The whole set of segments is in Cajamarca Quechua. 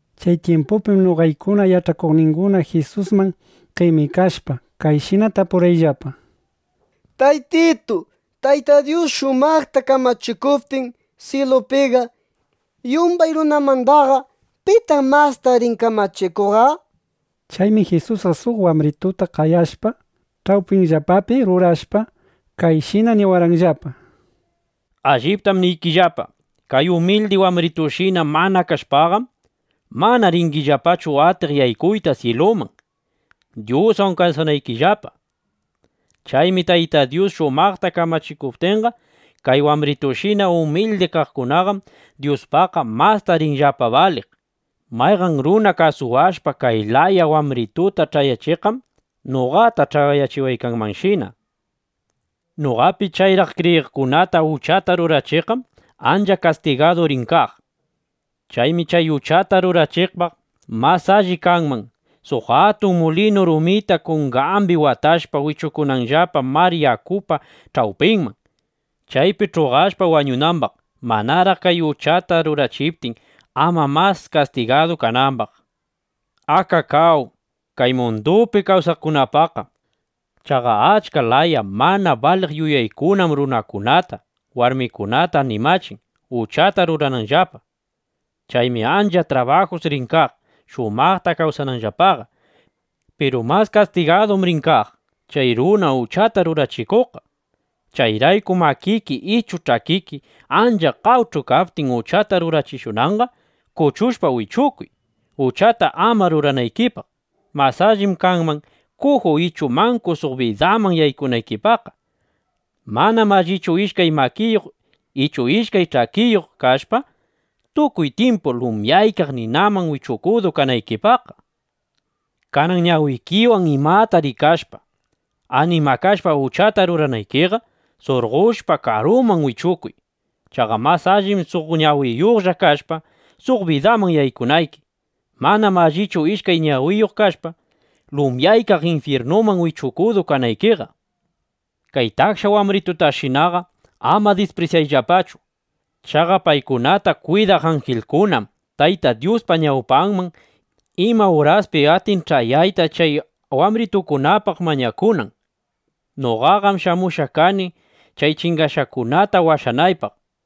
Chay tyimpupim noqaykuna yach'akuqninguna Jisusman qemikashpa, kayshina tapurqayllapa: —Taytitu, Tayta Dyus shumaqta kamachikuptin syilupiqa, yumbay runamandaqa ¿pitaq masta rin kamachikuqqa? nishpa. Chaymi Jisusqa suq wambrituta qayashpa, ch'awpiyllapapi rurashpa, kayshina niwarqanllapa: —Alliptam niykillapa, kay umildi wambritushina mana kashpaqam, mana ringillapachu atiq yaykuyta syiluman, Dyuswan kawsanaykillapa. Chaymi Tayta Dyus shumaqta kamachikuptinqa, kay wambritushina umildi kaqkunaqam Dyuspaqqa masta rinllapa baliq. Mayqan runa kasuwashpa kay laya wambrituta ch'ayachiqqam, noqata ch'ayachiwaykanshina, nishpa. ’Noqapi chayraq kriyiqkunata uchata rurachiqqam ancha kastigadu rin kaq. Chaymi chay uchata rurachiqpaqqa mas alli kanman, suq atun mulinu rumita kungambi watashpa, wichukunanllapa mar yakupa ch'awpinman, chaypi ch'uqashpa wañunambaq (manaraq chay uchata rurachiptin, ama mas kastigadu kanambaq). ¡Akakáw kay mundupi kawsaqkunapaqqa! Chaqa achka laya mana baliq yuyaykunam runakunata, warmikunata animachin, uchata rurananllapaqa. Chaymi ancha trabajus rin kaq, shumaqta kawsananllapaqa. ¡Piru mas kastigadum rin kaq chay runa uchata rurachikuqqa! ’Chayrayku makiki ichu ch'akiki ancha qawch'u kaptin uchata rurachishunanqa, kuchushpa wichukuy, uchata ama ruranaykipaq. Mas allim kanman, kuju ichu manku suq bidaman yaykunaykipaqqa. Manam allichu ishkay makiyuq ichu ishkay ch'akiyuq kashpa, tukuy tyimpu lumyaykaq ninaman wichukudu kanaykipaqqa. Kanan ñawikiwan imata rikashpa, animakashpa uchata ruranaykiqa, surqoshpa, karuman wichukuy. Chaqa mas allim suq ñawiyuqlla kashpa, suq bidaman yaykunayki. Manam allichu ishkay ñawiyuq kashpa, lumyaykaq infyirnuman wichukudu kanaykiqa. ’Kay taksha wambritutashinaqa ama disprisyayllapachu. Chaqa paykunata kwidaq anjilkunam Tayta Dyuspa ñawpanman ima uraspis atin ch'ayayta, chay wambritukunapaq mañakunan. ˻ Noqaqam shamushqa kani, chay chingashqakunata washanaypaq.˼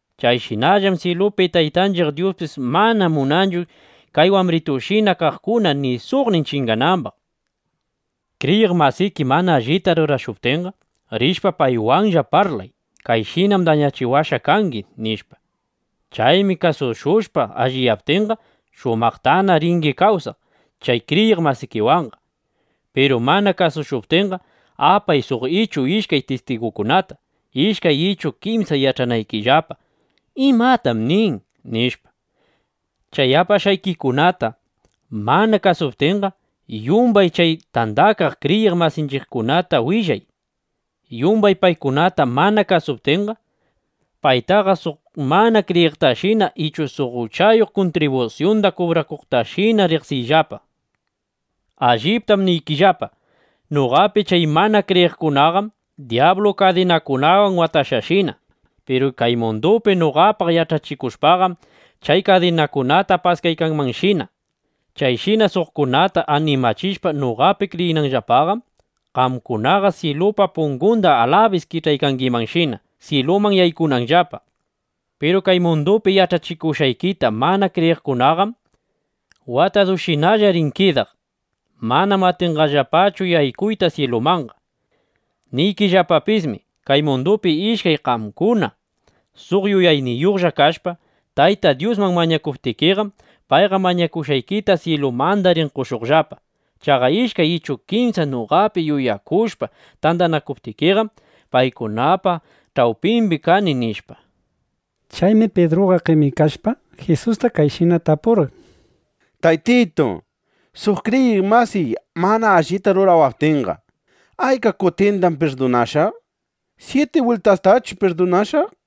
Chayshinam syilupi Taytanchiq Dyuspis mana munanchu kay wambritushina kaqkuna ni suqnin chinganambaq. ’Kriyiq masiki mana allita rurashuptinqa, rishpa, paywanlla parlay: “Kayshinam dañachiwashqa kangi”, nishpa. Chaymi kasushushpa alliyaptinqa, shumaqtana ringi kawsaq chay kriyiq masikiwanqa. Piru mana kasushuptinqa, apay suq ichu ishkay tistigukunata, ishkay ichu kimsa yach'anaykillapa, ¿Imatam nin? nishpa. Chay apashqaykikunata mana kasuptinqa, yumbay chay tandakaq kriyiq masinchiqkunata willay. Yumbay paykunata mana kasuptinqa, paytaqa suq mana kriyiqtashina ichu suq uchayuq kuntribusyunda kubrakuqtashinana riqsiyllapa. ’Alliptam niykillapa, noqapi chay mana kriyiqkunataqam dyablu kadinakunawan watashqashina. Piru kay mundupi noqapaq yach'achikushpaqam, chay kadinakunata paskaykangimanshina. Chayshina suqkunata animachishpa noqapi kriyinanllapaqam, qamkunaqa syilupa pungunda alabis kich'aykangimanshina, syiluman yaykunanllapa. Piru kay mundupi yach'achikushqaykita mana kriyiqkunaqam watadushinalla rin kidaq. Manam atinqallapachu yaykuyta syilumanqa. ’Niykillapapismi, kay mundupi ishkay qamkuna suq yuyayniyuqlla kashpa, Tayta Dyusman mañakuptikiqam, payqa mañashqaykita syilumanda rin qoshuqllapa. Chaqa ishkay ichu kimsa noqapi yuyakushpa tandanakuptinqam, paykunapa ch'awpimbi kani, nishpa. Chaymi Pidruqa qemikashpa, Jisusta kayshina tapurqan: —Taytitu, suq kriyiq masiy mana allita rurawaptinqa, ¿ayka kutindam pirdunashaq? ¿Syiti bwiltastachu pirdunashaq? nishpa.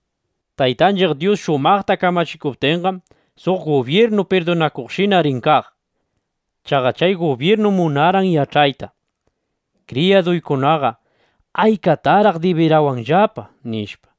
Jisusqam nirqambis: —Taytanchiq Dyus shumaqta kamachikuptinqam, suq gubyirnu pirdunakuqshina rin kaq. Chaqa chay gubyirnum munarqan yach'ayta: Kriyaduykunaqa, ¿aykatataq dibirawanllapa? nishpa.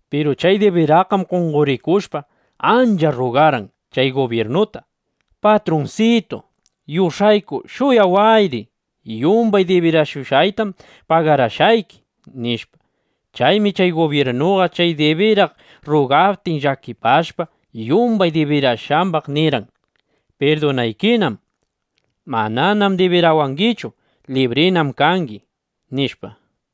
Piru chay dibiraqqam qonqorikushpa, ancha rrugarqan chay gubyirnuta: “Patrunsitu, yush'ayku shuyawayri. Yumbay dibirashushqaytam pagarashqayki”, nishpa. Chaymi chay gubyirnuqa chay dibiraq rrugaptin, llakipashpa, yumbay dibirashqambaq nirqan: “Pirdunaykinam. Mananam dibirawangichu. Librinam kangi”, nishpa.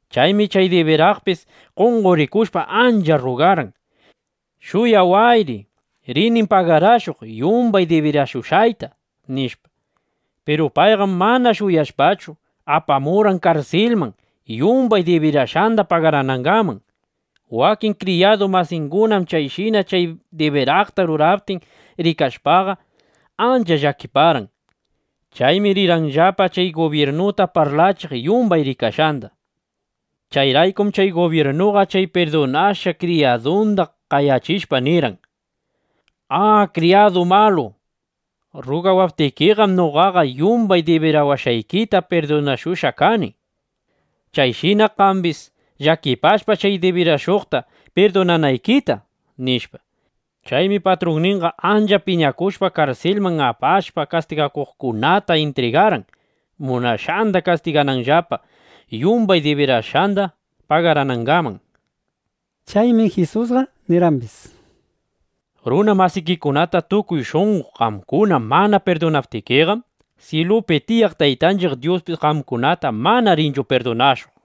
Chaymi chay dibiraqpis qonqorikushpa ancha rrugarqan: “Shuyawayri. Rinim pagarashuq yumbay dibirashushqayta”, nishpa. Piru payqam mana shuyashpachu, apamurqan karsilman, yumbay dibirashqanda pagaranangaman. Wakin kriyadu masingunam chayshina chay dibiraqta ruraptin rikashpaqa, ancha llakiparqan. Chaymi rirqanllapa chay gubyirnuta parlachiq yumbay rikashqanda. Chayraykum chay gubyirnuqa chay pirdunashqa kriyadunda qayachishpa nirqan: “¡A, kriyadu malu! Rrugawaptikiqam noqaqa yumbay dibirawashqaykita pirdunashushqa kani. Chayshina qambis llakipashpa, chay dibirashuqta pirdunanaykita”, nishpa. Chaymi patrunninqa ancha piñakushpa, karsilman apashpa, kastigakuqkunata intrigarqan, munashqanda kastigananllapa, yumbay dibirashqanda pagaranangaman. Chaymi Jisusqa nirqambis: —Runa masikikunata tukuy shunqo qamkuna mana pirdunaptikiqam, syilupi tiyaq Taytanchiq Dyuspis qamkunata mana rinchu pirdunashuq.